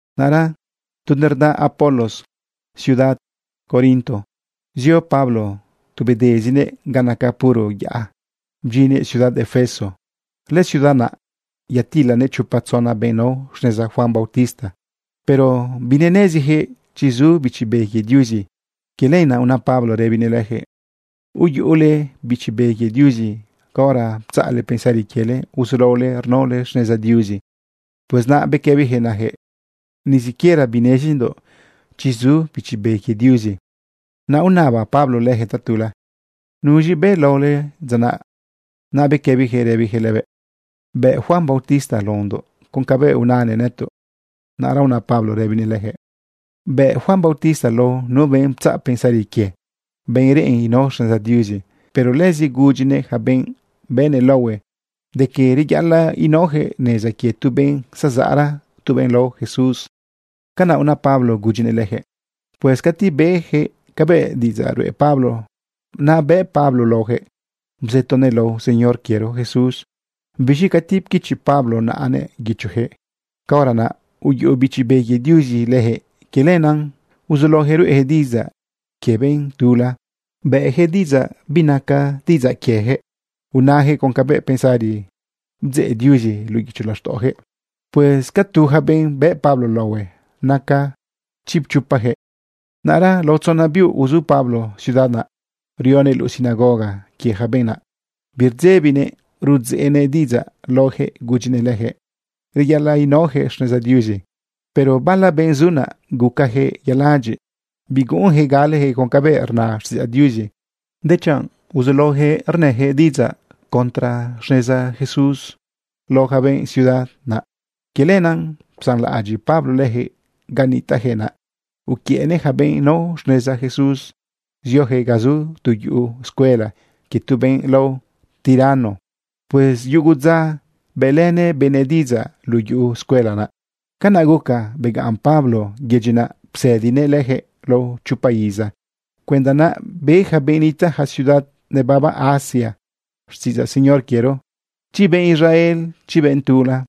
Naꞌra tu nerda Apolos ciudad Corinto zio Pablo tu bedezinëꞌ ga nacan puro yaꞌa bdyinnëꞌ ciudad Efeso. Lëciudad naꞌ yatilanëꞌ chopa tzona benꞌ nao xneza Juan bautista. Pero bineneziyaquëꞌ chi zu Bichi Be quie Diuzi. Quie lenaꞌ una Pablo rëbinëꞌ leyaquëꞌ: ―¿Uyuꞌule Bichi Be quie Diuzi caora ptzaꞌle pensari quiele uzulaole rnaole xneza Diuzi? Pues naꞌ bequëbiyaquëꞌ nayaquëꞌ: ―Ni siquiera binezindoꞌ chi zu Bichi Be quie Diuzi. Naꞌ unaba Pablo leyaquëꞌ tatula: ―¿Nuz̃i bëꞌ laole dza naꞌ, chiꞌ? Naꞌ bequëbiyaquëꞌ rëbijëꞌ lëbëꞌ: ―Bëꞌ Juan bautista laondoꞌ con cabëꞌ unanëꞌ nëtoꞌ. Naꞌra una Pablo rëbinëꞌ leyaquëꞌ: ―Bëꞌ Juan bautista lao nu benꞌ ptzaꞌ pensari quie, benꞌ reꞌen inao xneza Diuzi. Pero lëzi gudyinëꞌ yaca benꞌ bëꞌnëꞌ laohue de que reyaꞌalaꞌ inaojëꞌ neza quie tu benꞌ zazaꞌra, tu benꞌ lao Jesús. ―Canaꞌ una Pablo gudyinëꞌ lejëꞌ. Pues cati beyaquëꞌ cabëꞌ diꞌidzaꞌ ruꞌe Pablo, naꞌ bëꞌ Pablo laoyaquëꞌ bzëtonëꞌ lao Señor quiero Jesús. Biz̃i cati pquichi Pablo naꞌanëꞌ guichoyaquëꞌ, caora naꞌ uyuꞌu Bichi Be quie Diuzi leyaquëꞌ. Quie lenaꞌ uzulaoyaquëꞌ ruꞌeyaquëꞌ diꞌidzaꞌ quie benꞌ tula, bëꞌyaquëꞌ diꞌidzaꞌ binaca diꞌidzaꞌ quieyaquëꞌ, unayaquëꞌ con cabëꞌ pensari bdzeꞌ Diuzi luꞌu guicho laxtaꞌoyaquëꞌ. Pues ca tu yaca benꞌ bëꞌ Pablo laohue, naca chipchopayaquëꞌ. Naꞌra lao tzona biuꞌ uzu Pablo ciudad naꞌ rionëꞌ luꞌu sinagoga quie ja benꞌ naꞌ. Birdzebinëꞌ rudzeꞌnëꞌ diꞌidzaꞌ laoyaquëꞌ gudyinëꞌ leyaquëꞌ reyaꞌalaꞌ inaoyaquëꞌ xneza Diuzi. Pero bala benꞌ zu naꞌ gucajëꞌ yaladyiꞌ. Biguꞌunjëꞌ galejëꞌ con cabëꞌ rna xtiꞌidzaꞌ Diuzi, dechanꞌ uzulaoyaquëꞌ rnëyaquëꞌ diꞌidzaꞌ contra xneza Jesús lao yaca benꞌ ciudad naꞌ. Quie lenaꞌ psanlaꞌadyiꞌ Pablo leyaquëꞌ ga nitaꞌjëꞌ naꞌ. Uquiëꞌnëꞌ yaca benꞌ nao xneza Jesús zioyaquëꞌ ga zu tu yuꞌu escuela quie tu benꞌ lao Tiranno. Pues yugu dza bëꞌlënëꞌ benëꞌ diꞌidzaꞌ luꞌu yuꞌu escuela naꞌ. Canaꞌ guca begaꞌn Pablo yedyi naꞌ psëdinëꞌ leyaquëꞌ lao chopa iza cuenda naꞌ be yaca benꞌ nitaꞌ ja ciudad nebaba Asia xtiꞌidzaꞌ Señor quiero, chi benꞌ Israel, chi benꞌ tula.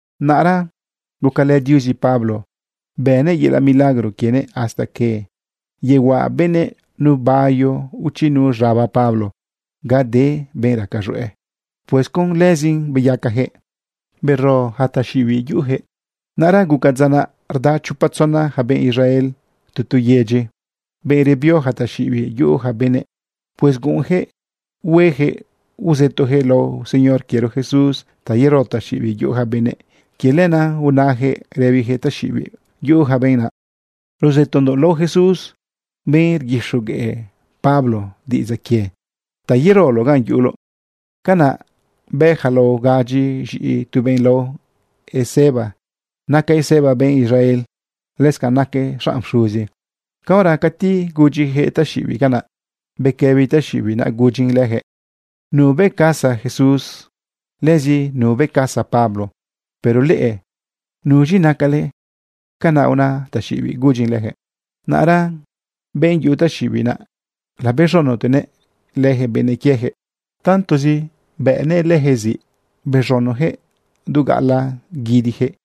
Naꞌra gucalë Diuzi Pablo, bënëꞌ yelaꞌ milagro quienëꞌ hasta que yehuaꞌa benëꞌ nu bayo o chi nu z̃aba Pablo ga de benꞌ raca z̃hueꞌ. Pues con lëzin beyacajëꞌ, bero ja taxiꞌibiꞌ yuꞌuyaquëꞌ. Naꞌra guca dza naꞌ rda chopa tzona yaca benꞌ Israel tu tu yedyi, benꞌ rebio yaca taxiꞌibiꞌ yuꞌu yaca benëꞌ. Pues guꞌunyaquëꞌ hueyaquëꞌ uzëtoyaquëꞌ lao Señor quiero Jesús ta yero taxiꞌibiꞌ yuꞌu ja benëꞌ. Quie lenaꞌ unayaquëꞌ rëbiyaquëꞌ taxiꞌibiꞌ yuꞌu yaca benꞌ naꞌ: ―Rzëtondoꞌ lao Jesús, benꞌ rguixogueꞌ Pablo diꞌidzaꞌ quie, ta yeroloꞌ ganꞌ yuꞌuloꞌ. Canaꞌ bë yaca lao gadyi z̃iꞌi tu benꞌ lao Esceva. Naca Esceva benꞌ Israel. Lëscanꞌ naquëꞌ xanꞌ pxuzi. Caora cati gudyiyaquëꞌ taxiꞌibiꞌ canaꞌ, bequëbi taxiꞌibiꞌ naꞌ gudyin leyaquëꞌ: ―Nubëꞌcazaꞌ Jesús, lëzi nubëꞌcazaꞌ Pablo, pero leꞌe, ¿nuz̃i nacale? ―Canaꞌ una taxiꞌibiꞌ gudyin leyaquëꞌ. Naꞌra benꞌ yuꞌu taxiꞌibiꞌ naꞌ, labëxotenëꞌ leyaquëꞌ bëꞌnëꞌ quieyaquëꞌ. Tantozi bëꞌnëꞌ leyaquëꞌ ziꞌ, bez̃unoyaquëꞌ du gaꞌalaꞌ guidiyaquëꞌ.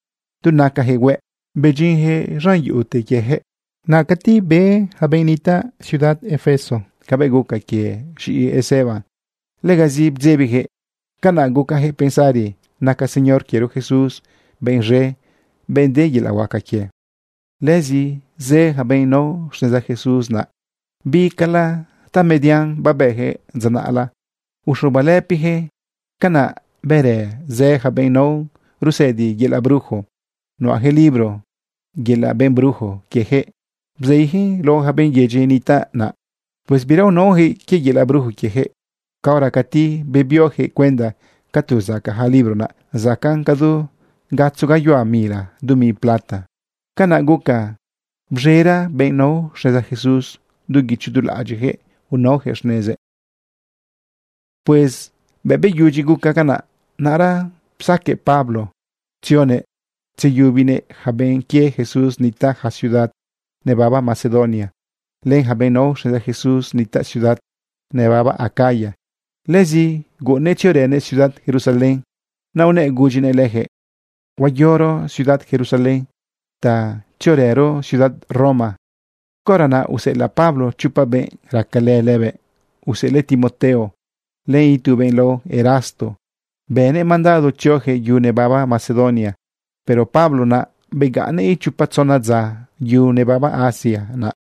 Du nacayaquëꞌ hueꞌ bedyinjëꞌ z̃an yuꞌute quieyaquëꞌ ziꞌ. Naꞌ cati be yaca benꞌ nitaꞌ ciudad Efeso cabëꞌ guca quie z̃iꞌi Esceva, legazi bdzebiyaquëꞌ. Canaꞌ gucayaquëꞌ pensari naca Señor quiero Jesús benꞌ z̃e, benꞌ de yelaꞌ huaca quie. Lëzi zë yaca benꞌ nao xneza Jesús naꞌ, bicala ta median babëyaquëꞌ dza naꞌla, uxubalëpiyaquëꞌ. Canaꞌ bërë zë yaca benꞌ nao rusëdi yelaꞌ brujo. Nuꞌayaquëꞌ libro yelaꞌ benꞌ brujo quieyaquëꞌ bzeiyaquëꞌn lao yaca benꞌ yedyi nitaꞌ naꞌ. Pues bira unaojëꞌ quie yelaꞌ brujo quiejëꞌ. Caora cati bebiojëꞌ cuenda ca tu zacaꞌ ja libro naꞌ, zacaꞌn cadu gatzo gayuhua mila dumi plata. Canaꞌ guca bz̃era benꞌ nao xneza Jesús. Du guicho du laꞌadyiꞌyaquëꞌ unaoyaquëꞌ xnezëꞌ. Pues bëꞌ beyudyi guca canaꞌ, naꞌra psaqueꞌ Pablo tzionëꞌ tzeyubinëꞌ yaca benꞌ quie Jesús nitaꞌ ja ciudad nebaba Macedonia len ja benꞌ nao xneza Jesús nitaꞌ ciudad nebaba Acaya. Lëzi guꞌunnëꞌ tziorënëꞌ ciudad Jerusalén. Naꞌ unëꞌ gudyinëꞌ lejëꞌ: ―Huayoro ciudad Jerusalén, te naꞌ tziorëro ciudad Roma. Caora naꞌ useꞌelaꞌ Pablo chopa benꞌ racalë lëbëꞌ, useꞌelëꞌ Timoteo len itu benꞌ lao Erasto. Bënëꞌ mandado tzioyaquëꞌ yu nebaba Macedonia. Pero Pablo naꞌ begaꞌnnëꞌ ichopa tzona dza yu nebaba Asia naꞌ.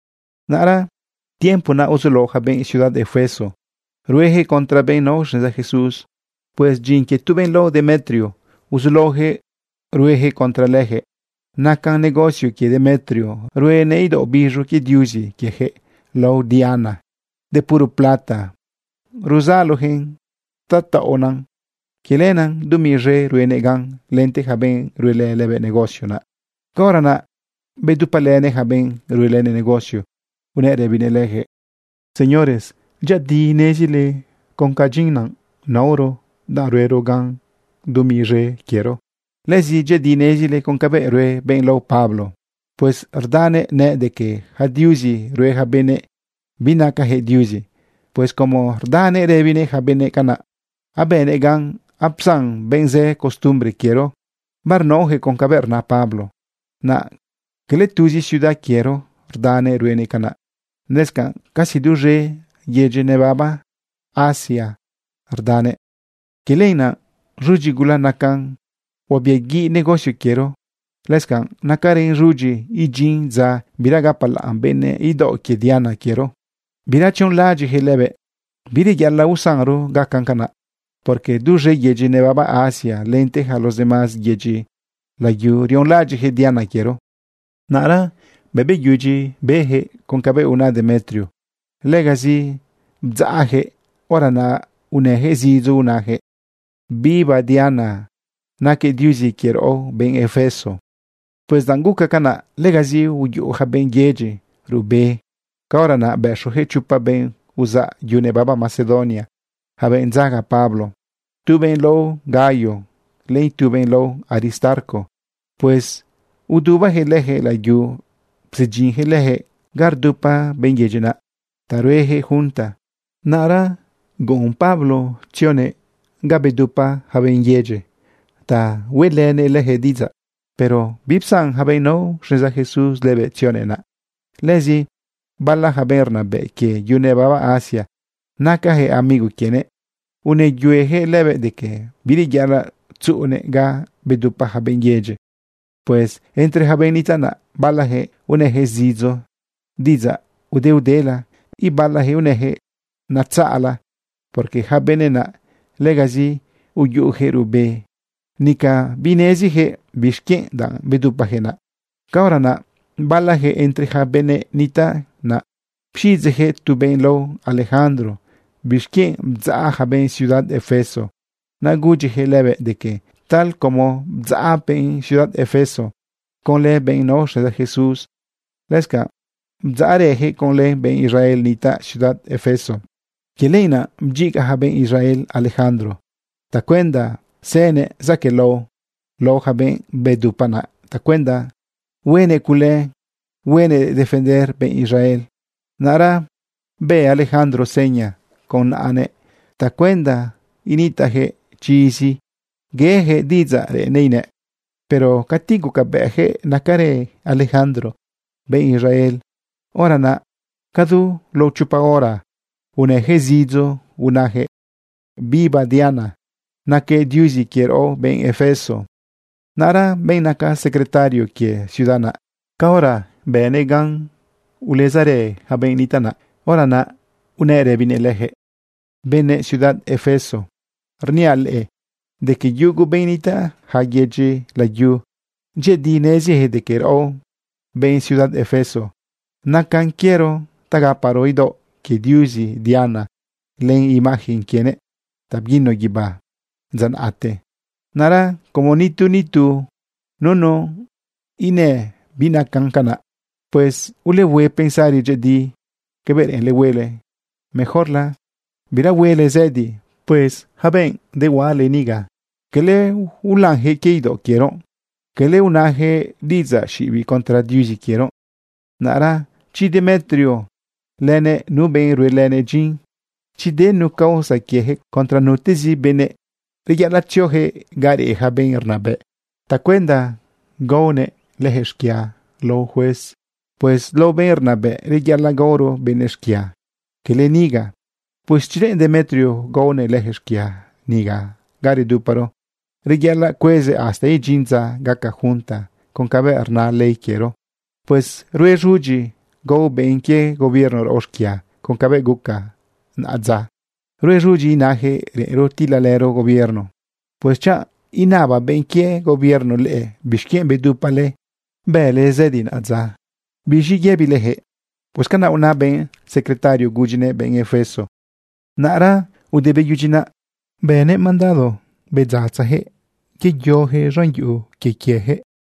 Naꞌra tiempo naꞌ uzulao ja benꞌ ciudad Efeso rueyaquëꞌ contra benꞌ nao xneza Jesús. Pues dyin quie tu benꞌ lao Demetrio uzulaojëꞌ ruejëꞌ contra lejëꞌ. Nacan negocio quie Demetrio ruenëꞌ idaoꞌ biz̃u quie diuzi quieyaquëꞌ lao Diana. De puro plata ruzaloyaquëꞌn ta taꞌonan. Quie lenaꞌ dumi zë ruenëꞌ gan lente ja benꞌ ruelë lëbëꞌ negocio naꞌ. Caora naꞌ bedupalënëꞌ yaca benꞌ ruelënëꞌ negocio, unëꞌ rëbinëꞌ leyaquëꞌ: ―Señores, dyëꞌëdi nezile con ca dyin naꞌ naoro danꞌ ruero gan dumi zë quiero. Lëzi dyëꞌëdi nezile con cabëꞌ rue benꞌ lao Pablo. Pues rdanëꞌ nëꞌ de que yaca diuzi rue ja benëꞌ, binacayaquëꞌ diuzi. Pues como rdanëꞌ rëbinëꞌ ja benëꞌ canaꞌ, abënëꞌ gan apsan benꞌ zë costumbre quiero, barnaoyaquëꞌ con cabëꞌ rna Pablo. Naꞌ cala tuzi ciudad quiero rdanëꞌ ruenëꞌ canaꞌ, lëscanꞌ casi duz̃e yedyi nebaba Asia rdanëꞌ. Quie lenaꞌ z̃udyi gula nacan huabiaguiꞌ negocio quiero. Lëscanꞌ nacarën z̃udyi idyin dza bira gapalaꞌn benëꞌ idaoꞌ quie Diana quiero, bira tzionlaꞌadyiꞌyaquëꞌ lëbëꞌ. Bireyaꞌalaꞌ usanro gacan canaꞌ, porque duz̃e yedyi nebaba Asia lente yaca los demás yedyi layu rionlaꞌadyiꞌyaquëꞌ Diana quiero. Naꞌra bëꞌ beyudyi beyaquëꞌ con cabëꞌ una Demetrio, legazi bdzaꞌyaquëꞌ. Hora naꞌ unëyaquëꞌ zidzo unayaquëꞌ: ―¡Viva Diana. Naquëꞌ diuzi quie raꞌo benꞌ Efeso! Pues danꞌ gucan canaꞌ, legazi uyuꞌu yaca benꞌ yedyi ruꞌbe. Caora naꞌ bëxoyaquëꞌ chopa benꞌ uzaꞌ yu nebaba Macedonia, yaca benꞌ dzaga Pablo, tu benꞌ lao Gayo, len itu benꞌ lao Aristarco. Pues udubajëꞌ leyaquëꞌ layu psedyinjëꞌ leyaquëꞌ ga rdupa benꞌ yedyi naꞌ ta rueyaquëꞌ junta. Naꞌra guꞌun Pablo tzionëꞌ ga babedupa ja benꞌ yedyi ta hueꞌlënëꞌ leyaquëꞌ diꞌidzaꞌ, pero bipsan yaca benꞌ nao xneza Jesús lëbëꞌ tzionëꞌ naꞌ. Lëzi bala yaca benꞌ rnabëꞌ quie yu nebaba Asia, nacayaquëꞌ amigo quienëꞌ, unëyueyaquëꞌ lëbëꞌ de que bireyaꞌalaꞌ tzuꞌunëꞌ ga babedupa yaca benꞌ yedyi. Pues entre yaca benꞌ nitaꞌ naꞌ, balajëꞌ unëyaquëꞌ zidzo diꞌidzaꞌ udeudela. Ibalajëꞌ unëjëꞌ natzaꞌla, porque yaca benëꞌ naꞌ legazi uyuꞌujëꞌ ruꞌbe, nica bineziyaquëꞌ bixquienꞌ danꞌ bedupajëꞌ naꞌ. Caora naꞌ balayaquëꞌ entre yaca benëꞌ nitaꞌ naꞌ pxiꞌidzeꞌyaquëꞌ tu benꞌ lao Alejandro bixquienꞌ bdzaꞌ ja benꞌ ciudad Efeso. Naꞌ gudyiyaquëꞌ lëbëꞌ de que tal como bdzaꞌ benꞌ ciudad Efeso conlë benꞌ nao xneza Jesús, lëscanꞌ bdzaꞌrëyaquëꞌ conlë benꞌ Israel nitaꞌ ciudad Efeso. Quie lenaꞌ bdyiga yaca benꞌ Israel Alejandro tacuenda zënëꞌ zaquëꞌlao lao yaca benꞌ bedupa naꞌ tacuenda huenëꞌ cule huenëꞌ defender benꞌ Israel. Naꞌra bë Alejandro seña con naꞌanëꞌ tacuenda initaꞌyaquëꞌ chizi yeyaquëꞌ diꞌidzaꞌ reꞌennëꞌ inëꞌ. Pero cati gucabëꞌyaquëꞌ nacarë Alejandro benꞌ Israel, hora naꞌ cadu lao chopa hora unëyaquëꞌ zidzo unayaquëꞌ: ―¡Viva Diana! ¡Naquëꞌ diuzi quie raꞌo, benꞌ Efeso! Naꞌra benꞌ naca secretario quie ciudad naꞌ, caora bënëꞌ gan ulezarë yaca benꞌ nitaꞌ naꞌ, hora naꞌ unëꞌ rëbinëꞌ leyaquëꞌ: ―Benëꞌ ciudad Efeso, rniaꞌ leꞌe de que yugu benꞌ nitaꞌ ja yedyi layu, dyëꞌëdi neziyaquëꞌ de que raꞌo, benꞌ ciudad Efeso, nacan quiero ta gaparo idaoꞌ quie diuzi Diana len imagen quienëꞌ ta bguino guibá dza naꞌte. Naꞌra como nitu, nitu, nunu inëꞌ binacan canaꞌ, pues ulehue pensari dyëꞌëdi cabëꞌ reꞌenle huele. Mejorla bira huele zëdi. Pues yaca benꞌ dehuaꞌale niga, cala ulanyaquëꞌ quie idaoꞌ quiero, cala unayaquëꞌ diꞌidzaꞌ xiꞌibiꞌ contra diuzi quiero. Naꞌra chi Demetrio lënëꞌ nu benꞌ ruelënëꞌ dyin, chi de nu causa quieyaquëꞌ contra nutezi benëꞌ, reyaꞌalaꞌ tzioyaquëꞌ ga reꞌ ja benꞌ rnabëꞌ tacuenda gaonëꞌ leyaquëꞌ xquia lao juez. Pues lao benꞌ rnabëꞌ reyaꞌalaꞌ gaoro benëꞌ xquia, quele niga. Pues chi reꞌen Demetrio gaonëꞌ leyaquëꞌ xquia niga ga reduparo, reyaꞌalaꞌ cuezëꞌ hasta idyin dza gaca junta con cabëꞌ rna ley quiero. Pues rue z̃udyi gao benꞌ quie gobierno raꞌo xquia con cabëꞌ guca naꞌadza. Rue z̃udyi inayaquëꞌ reꞌenro tilalëro gobierno. Pues, chanꞌ inaba benꞌ quie gobierno leꞌe bixquienꞌ bedupale bële zëdi naꞌadza, ¿biz̃i yëbileyaquëꞌ? Pues canaꞌ una benꞌ secretario gudyinëꞌ benꞌ Efeso. Naꞌra ude beyudyi naꞌ, bënëꞌ mandado bedzatzayaquëꞌ yeyoyaquëꞌ z̃an yuꞌu quie quieyaquëꞌ.